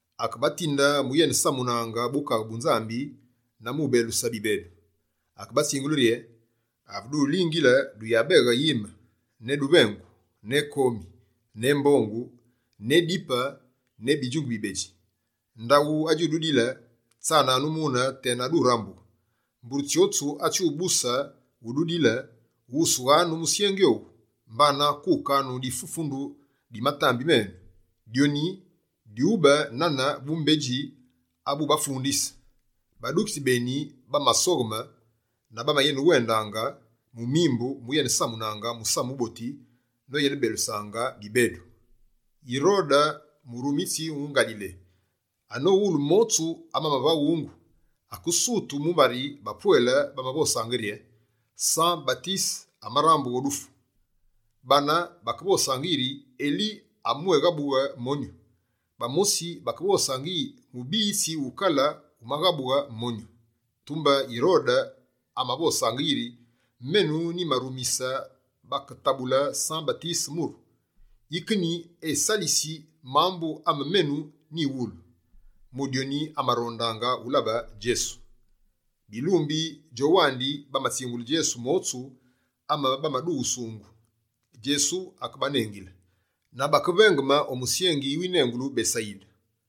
Akebatinde mu uyenesamune Bukaghe bu Nzambi na mu ubeluse bibedu. Akebatsingule rye: «Ave dulingile, duyabeghe yime: ne duvengu, ne komi, ne mbongu, ne dipe ne bidjunge bibedji. Ndaghu adjududile, tsananu mune tena durambughe. Mbure tsyotsu atsyubuse ududile, ghusughanu musyengi owu, mbana kukanu difufundu di matambi menu, dyoni dyube nane bumbedji abubafundise.» Badukitsi beni bamasogheme, na bamayenewendaange, mu mimbu, mu uyenesamunaange musamu wuboti noyenebelusaange bibedu. Yirode murumitsi wu Ngalile, anowulu motsu amamavaghungu, akesutu mumbari bapwele bamavosaange rye: «San-Batise amarambughe o dufu.» Bane bakevosaange yiri: «Eli amabwéghabughe monyu.» Bamosi bakevosaange yi: «Mubiyitsi wukale wumaghabughe monyu.» Tumbe Yirode amavosaange iri: «Menu nyimarumise baketabule San-Batise muru. Yike nyi esalisi mambu ame menu nyiwulu?» Mu dyoni, amarondaange ulabe Djesu. Bilumbi djowandi bamatsingule Djesu motsu amebamadughusungu. Djesu akebanengile na bakevengeme o musyengi winengulu Besayide.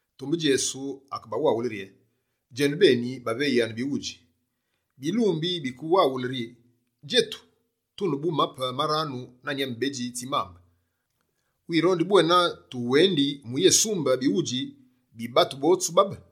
Tumbe Djesu akebawaghule rye: «Djenubeni, baveyanu bighudji!» Bilumbi bakemuwalu rye: «Djetu, tune bu mape maranu na nyame bedji tsi mambe. Wirondi bwena tuwendi mu yésumbe bighudji bi batu botsu babe?»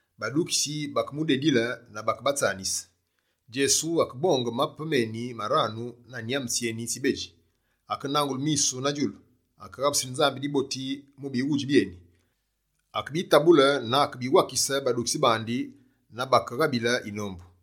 Badukitsi bakemudedile na bakebatsanise. Djesu akebonge mape meni maranu na nyame tsyeni tsibedji. Akenangule misu na djulu, akeghabusile Nzambi diboti mu bighudji byeni, akebitabule na akebiwakise badukitsi bandi na bakeghabile yinombu.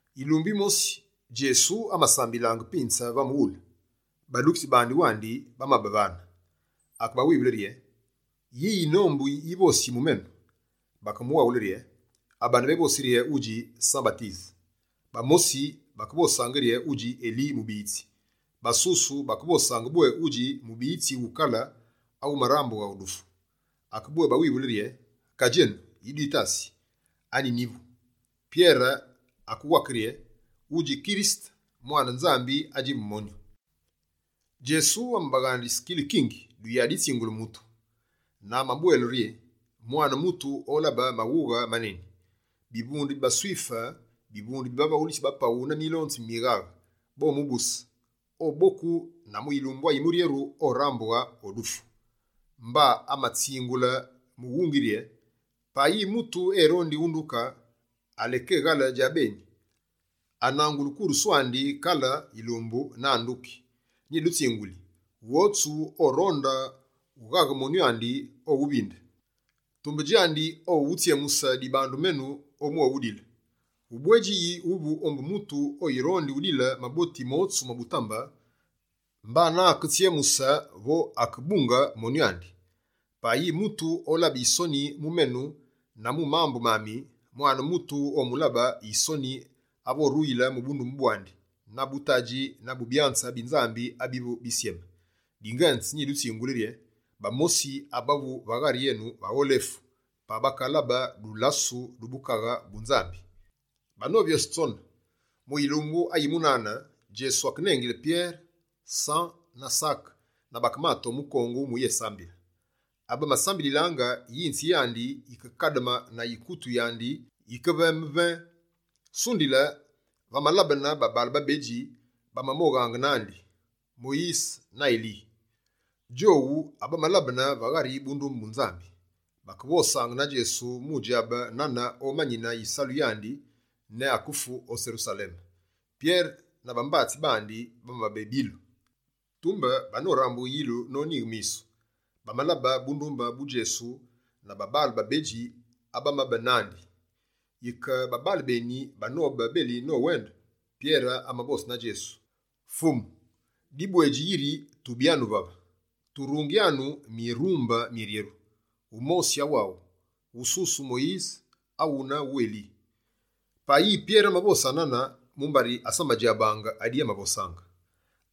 Yilumbu yimosi Djesu amasambilaange pinze va mughule, badukitsi bandi wandi bamabe vane. Akebawivule rye: «Yi yinombu yivosi mu menu?» Bakemuwaghule rye: «Abane bévosi rye wudji San-Batise, bamosi bakevosaange rye wudji Eli mubiyitsi, basusu bakevosaange bwé wudji mubiyitsi wukale awumarambughe o dufu.» Akebwébawivule rye: «Ka djenu, yi dwitasi? Anyi nyivu?» Pyere akewake rye: «Wudji Kirisete, mwane Nzambi adjivu monyu.» Djesu amabaghandise kilikingi duyaditsingule mutu. Na amabwele rye: «Mwane Mutu olabe maghughe maneni. Bivunde bi baSwife, bivunde bi bavaghulitsi ba paghu na milonzi mi mighaghe bomubuse, oboku na mu yilumbu ayimuryeru orambughe o dufu.» Mba amatsingule mughungi rye: «Payi mutu erondi unduke, alekeghale djabeni, ananguli kurusu andi kale yilumbu na anduki. Nyidutsinguli: Wotsu oronde wughaghe monyu andi, owuvinde; tumbe djandi awu owutsyemuse dibandu menu, omwéwudile. Ubwedji yi wuvu ombu mutu awirondi udile maboti motsu ma butambe, mbana aketsyemuse vo akebunge monyu andi? Payi mutu olabe yisoni mu menu na mu mambu mami, Mwane Mutu omulabe yisoni ave oruyile mu bundumbe bwandi, na bu Tadji na bu byanze bi Nzambi abivu bisyeme. Dingenze, nyidutsinguli rye: bamosi abavu vave bagholefu, pa bakalabe dulasu du Bukaghe bu Nzambi.» Banovyose tsone, mu yilumbu ayi munane, Djesu akenengile Pyere, San na Sake na bakemate o mukongu muyésambile. Ave bamasambililaange yinzi yandi yikekademe na yikutu yandi yike veme «vee». Sundile, va malabene babaale babedji bamamoghaange nandi: Moyise na Eli. Djowu abamalabene va ghari bundumbe bu Nzambi, bakevosaange na Djesu mu djabe nane omanine yisalu yandi ne akeyefu o Serusaleme. Pyere na bambatsi, bamabe bilu. Tumbe banorambughe yilu nonyighe misu, bamalabe bundumbe bu Djesu na babaale babedji abamabe nandi. Yike babaale beni banobe beli nowende, Pyere amavose na Djesu rye: «Fumu, dibwedji yiri tubyanu vave. Turungyanu mirumbe miryeru: wumosi awaghu, wususu wu Moyise, awune wu Eli. Payi Pyere avose nane, mumbari asamadjabaange adi amavosaange.»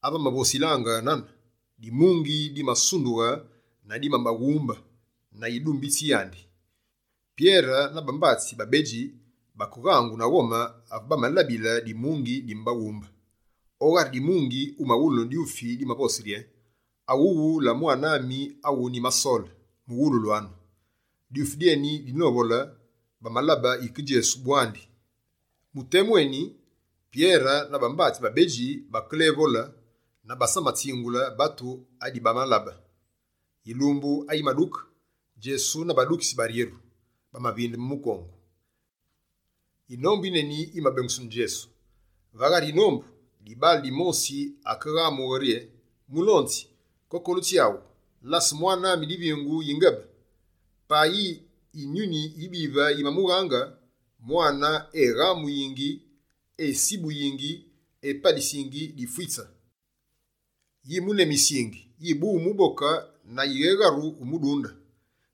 Ave amavosilaange nane, dimungi dimasundughe na dimabaghumbe na yidumbitsi yandi. Pyere na bambatsi babedji bakeghangu na ghome ave bamalabile dimungi dimabaghumbe. O ghari dimungi umawulunu dyufi dimavose rye: «Awuwu la Mwane ami awu nyimasole, muwululwanu!» Dyufi dyeni dinovole, bamalabe yike Djesu bwandi. Mu temu eni, Pyere na bambatsi babedji bakelévole, na basamatsingule batu adibamalabe. Yilumbu ayimaduke, Djesu na badukitsi baryeru bamavindeme mukongu. Yinombu yineni yimabengusunu Djesu. Va ghari yinombu, dibaale dimosi akeghamughe rye: «Mulonzi kokolu tsyaghu, lase mwane ami divingu yingebe! Payi Yinyuni yibive yimamughaange, mwane eghamuyingi, esibuyingi, epalisingi difwitse. Yimunemisingi, yibu umuboke na yighegharu umudunde.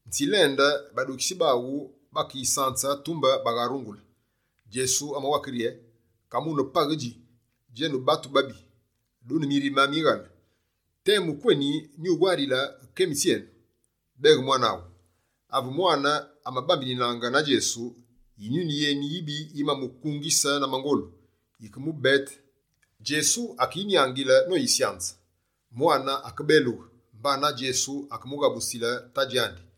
Nyitsilende badukitsi baghu bakeyisanze, tumbe bagharungule.» Djesu amawake rye: «Kamune paghe dji, djenu batu babi, dune mirime mighale. Temu kweni nyuwarilaange kemi tsyenu? Beghe mwane aghu.» Ave mwane amabambininaange na Djesu, Yinyuni yeni yibive yimamukungise na mangolu, yikemubete. Djesu akeyinyangile noyisanze. Mwane akebelughe, mbana Djesu akemughabusile tadji andi.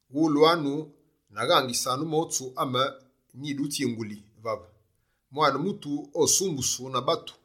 «Wulwanu na ghangisanu motsu ame nyikidutsingule vave: Mwane Mutu osumbusu na batu.»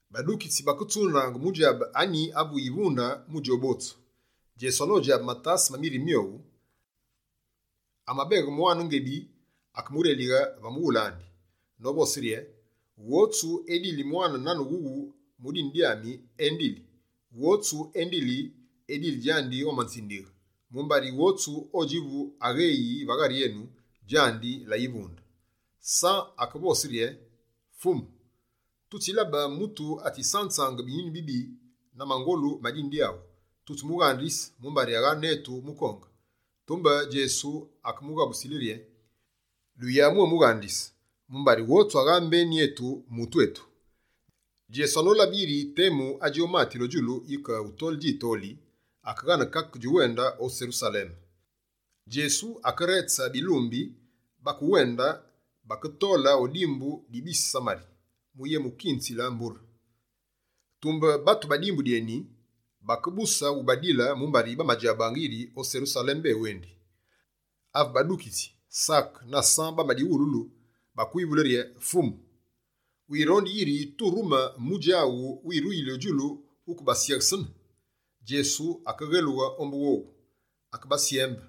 Badukitsi baketsundaange mu djabe anyi avu yivunde mu djowu botsu. Djesu anodjabe matase ma mirime myowu, amabeghe mwane ngebi, akemurelighe va mughule andi, novose rye: «Wotsu edili mwane nane wughu mu dine dyami, endili. Wotsu endili, edili djandi omanzindighe, mumbari wotsu odjivu agheyi va ghari enu, djandi la yivunde.» San akevose rye: «Fumu, tutsilabe mutu atsisanzaange binyuni bibi na mangolu ma dine dyaghu. Tutsimughandise mumbari agha netu mukonge.» Tumbe, Djesu akemuwaghule rye: «Duyabwémughandise, mumbari wotsu agha mbeni enu, mutu enu.» Djesu anolabe yiri temu adji omatile o djulu yike wutole djitoli, akeghane kake djuwende o Serusaleme. Djesu akeretse bilumbi, bakewende, baketole o dimbu di bise Samari mu yemukunzile mbure. Tumbe batu ba dimbu dyeni, bakebuse wubadile mumbari bamadjabaange yiri o Serusaleme ewendi. Ave badukitsi Sake na San bamadighululu, bakewivule rye: «Fumu, wirondi yiri turumi mudji awu wiruli o djulu wukebasyeghesene?» Djesu akeghelughe ombu wowu, akebasyembe.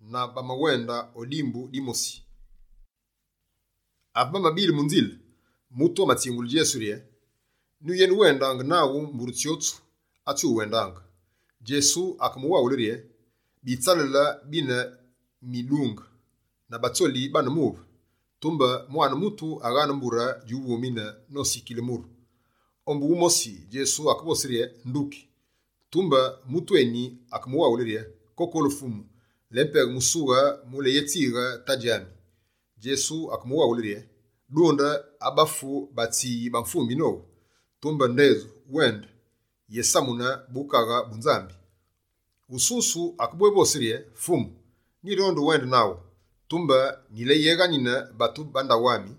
Na bamawende o dimbu dimosi. Ave bamabile mu nzile, mutu amatsingule Djesu rye: «Nyuyenewendaange naghu mbure tsyotsu atsiwuwendaange.» Djesu akemuwaghule rye: «Bitsalale bine midunge na batsoli bane muve, tumbe Mwane Mutu aghaane mbure djuvumine nosikile muru.» Ombu wumosi, Djesu akevose rye: «Nduki.» Tumbe mutu eni akemuwaghule: «Kokolu Fumu, lépeghe musughe muleyétsighe tadji ami.» Djesu akemuwaghule rye: «Dunde abafu batswiyi bamvumbi nowu, tumbe ndedju wende, yesamune Bukaghe bu Nzambi.» Wususu akebwévose rye: «Fumu, nyirondi uwende naghu, tumbe nyileyeghanine batu ba ndaghu ami.»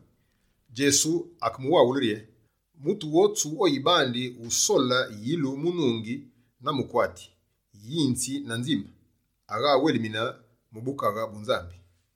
Djesu akemuwaghule rye: «Mutu wotsu oyibandi wusole yilu mu nungi na mukwati, yinzi na nzime, agha awelimine mu Bukaghe bu Nzambi.»